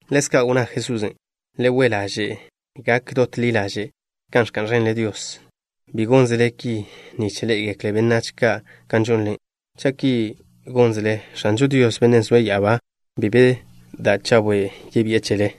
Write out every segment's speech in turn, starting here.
Ḻezka' wnná Jesusen': —Le we' ḻaže' gak dot ḻi ḻaže' kan ẕka'n ẕenle Dios. Bi gónzele ki nich ḻé'egekle benách ka' kan žonle. Cha' ki gónzele, X̱ažo Dios, Bennen' zoe' ya'abá, bi be da' chawe' yebi'e chele.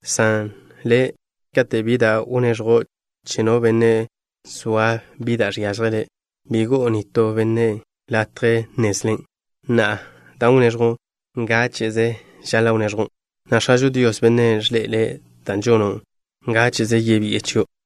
San le', kate' bi da' wneẕjo' che no benne' zoa bi da' žiážjele', bi go'o nitó benne' latje nnezlen'. Na'a, dan' wneẕjo', ngáche'ze žaḻa' wneẕjon', na' X̱ažo Dios, Bennen' ẕḻe'ele' dan' žono' ngáche'ze, yebi'e chio'.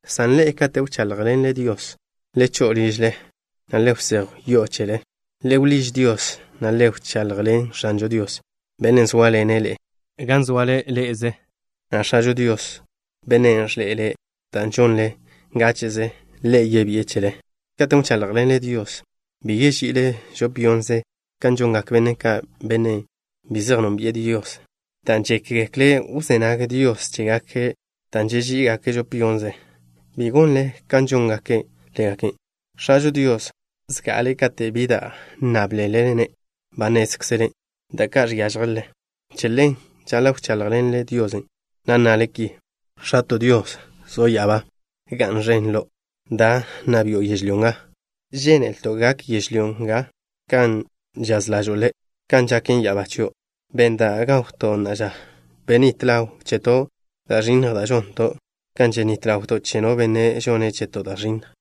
San ḻe'e, kate' wcháḻjḻenle Dios, le cho'o ližle, na' le wsejw yo'o chele. Le wḻíž Dios, na' le wchaḻjḻen X̱ažo Dios, Bennen' zóaḻene' ḻe'e gan zoale chézele, na' X̱ažo Dios, Bennen' ẕḻe'ele' da' žonle ngáche'ze, Ḻe' yebi'e chele. ’Katen' wcháḻjḻenle Dios bi yeži'ile žop yonnze kan žongak benne' ka', benne' bi zej nónbi'e Dios, dan' žékgekle' wzé nag Dios chégake' dan' žeží'igake' žop yonnze. Bi gonle kan žóngake' ḻégake'. X̱ažo Dios, zga'ale kate' bi da' nnáblele-ne', ba nnézkzele' da' ka' žiážjelele. Che ḻen, žaḻa' wcháḻjḻenle Dios, na' nnale ki: X̱ato' Dios, zo' ya'abá, ga'n ẕen Lo'. Da, nna bi'o yežlyó nga. Žénelto' gaken yežlyó nga kan žaz ḻažo'o Le' kan žaken ya'abá chio'. Benn da' gawto' na'a ža. Benít ḻaw cheto' da' ẕinnj da' žonto', kan ženít ḻawto' che no benne' žone' cheto' da' ẕinnj.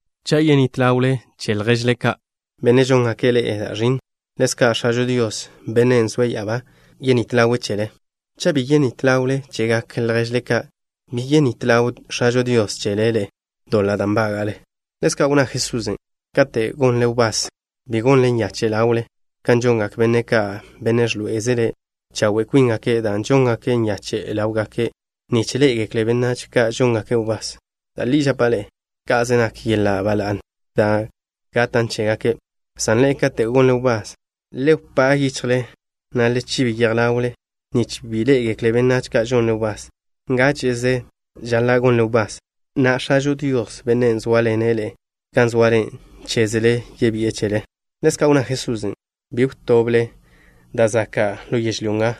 ’Cha' yenít ḻawle chegak lježle ka', benne' žóngake' ḻe'e da' ẕinnj, ḻezka' X̱ažo Dios, Bennen' zoe' ya'abá, yenít ḻawe' chele ḻe'e. Cha' bi yenít ḻawle chegak lježle ka', bi yenít ḻaw X̱ažo Dios chele ḻe'e doḻa' da' nbága'le. Ḻezka' wnná Jesusen': —Kate' gonle wbás, bi gonle nyache' ḻawle kan žongak benne' ka', benne' ẕḻoé'ezele chawe' kwíngake', dan' žóngake' nyache' ḻáwgake' nich ḻé'egekle benách ka' žóngake' wbás. Da' li žapa' ḻe'e, ka'ze nak yeḻa' ba la'ne da' gatan' chégake'. San ḻe'e, kate' gonle wbás, le wpá' yichjle, na' le chib ḻawle, nich bi ḻé'egekle benách ka' žonle wbás. Ngáche'ze žaḻa' gonle wbás, na' X̱ažo Dios, Bennen' zóaḻene' ḻe'e gan zoale chézele, yebi'e chele. Ḻezka' wnná Jesusen': —Bi wtoble da' zaka' ḻo yežlyó nga,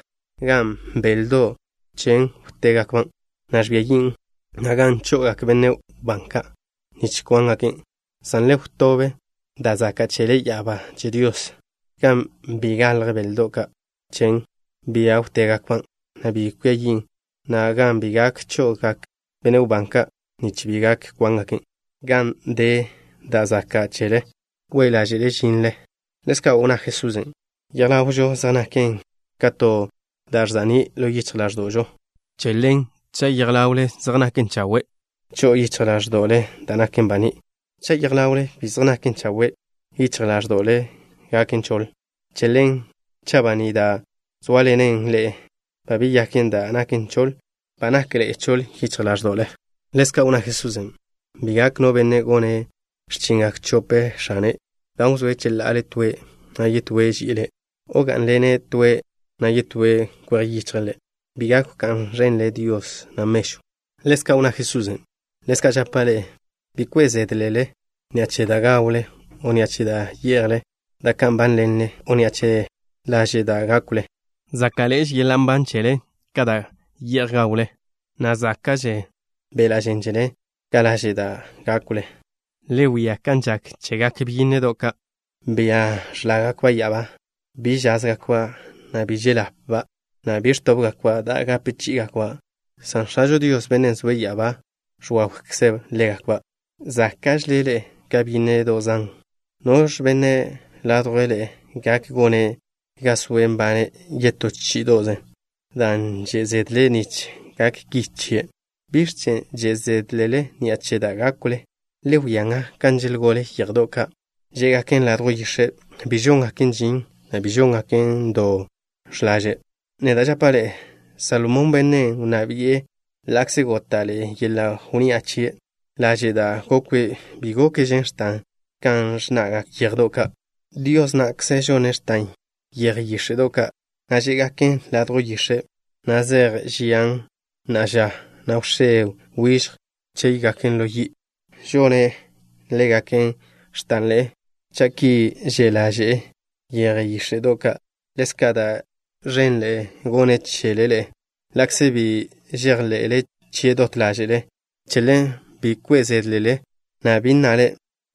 gan beldo' chen wtébgakban', na' ẕbia yin', na' gan cho'ogak benne' wbán ka', nich kwángaken'. San le wtób da' zaka' chele ya'abá che Dios, gan bi galj beldo' chen, bia wtébgakban', na' bi cwia yin', na' gan bi gak cho'ogak benne' wbán ka', nich bi gak kwángaken'. Gan de da' zaka' chele, we' ḻáže'le žinle. Ḻezka' wnná Jesusen': —Yej ḻawžo zej naken ka to da' ẕza'ní' ḻo yichj ḻáẕdo'žo. Che ḻen, cha' yej ḻawle zej naken chawe', cho'o yichj ḻáẕdo'le da' naken baní'. Cha' yej ḻawle bi zej naken chawe', yichj ḻáẕdo'le gaken choḻ. Che ḻen, cha' baní' da' zóaḻenen ḻe'e ba beyaken da' naken choḻ, ba nakḻe'e choḻ yichj ḻáẕdo'le. Ḻezka' wnná Jesusen': —Bi gak no benne' gone' x̱chingak chope x̱ane', dan' wzóe' cheḻa'ale toen', na' yetóen' ži'ile' ḻe', o gá'nḻene' toen', na' yetóen' kwej yichje' ḻe'. Bi gak wká'n ẕenle Dios, na' mežw. Ḻezka' wnná Jesusen': —Ḻezka' žapa' ḻe'e: bi kwe' zédlele ni'a che da' gawle o ni'a che da' ye'jle, da' ka' nbánḻenle, o ni'a che laže' da' gákwle. Záka'ḻe'eže yeḻa' nban chele ka da' ye'j gawle, na' záka'že beḻa' žen chele ka laže' da' gákwle. Le wia kan žak chegak byínnedo' ka', bia ẕlágakba' ya'abá. Bi žázgakba', na' bi žel-ḻapba', na' bi ẕtóbgakba' da' gape chí'igakba', san X̱ažo Dios, Bennen' zoe' ya'abá, ẕwawkze' ḻégakba'. Záka'žele ḻe'e ka byínnedo' zan. ¿Noẕ benne' ládjwle ḻe'e gak gone' ga soe' nbane' yetó chí'ido'ze dan' že' zedle' nich gak ki chie'? ’¿Biẕ chen' že' zédlele ni'a che da' gákwle? Le wia nga kan želgole yéjedo' ka' žé'gaken ladjw yix̱e'. Bi žóngaken žin, na' bi žóngaken do x̱laže'. Neda' žapa' ḻe'e, Salomón, bennen' wnná bi'e, ḻa'kze góta'ḻe'e yeḻa' wnni'a chie', laže' da' gokwe' bi gokžen x̱tan ka žnna'gak yéjedo' ka'. Dios na'kze žone' x̱tan yeje yíx̱e'do' ka', da' žé'gaken ladjw yix̱e', na' zej žian na'a ža, na' wx̱é wižj chéygaken ḻo yi'. Žone' ḻégaken x̱tanḻe'e. Cha' ki že' ḻaže'e yeje yíx̱e'do' ka', ḻezka' da' ẕenḻe'e gone' chele ḻe'e, ḻa'kze bi žejḻe'le chie' dot ḻáže'le. Che ḻen, bi kwe' zédlele, na' bi nnale: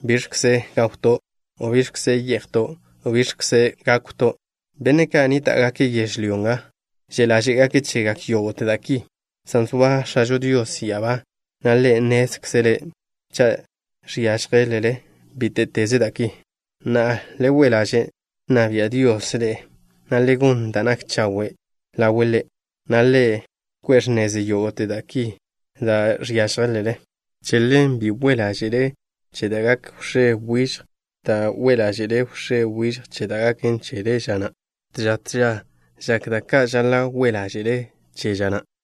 “¿Biẕkze gawto'?” o “¿Biẕkze ye'jto'?” o “¿Biẕkze gákwto'?” Benne' ka' nníta'gake' yežlyó nga že' ḻáže'gake' chegak yógo'te da' ki, san zoa X̱ažo Dios ya'abá, na' Ḻe' nnézkzele' cha' žiážjelele bíte'teze da' ki. Na'a, le we' ḻaže' nna bia' Dios ḻe'e, na' le gon da' nak chawe' ḻawe' Ḻe', na' Ḻe' ko'e x̱nezle yógo'te da' ki da' žiážjelele. Che ḻen, bi kwe' ḻáže'le che da' gak wx̱é wižj, dan' gak kwe' ḻáže'le wx̱é wižj che da' gaken chele ža na'. Tža tža žak da' ka' žaḻa' kwe' ḻáže'le chen ža na'.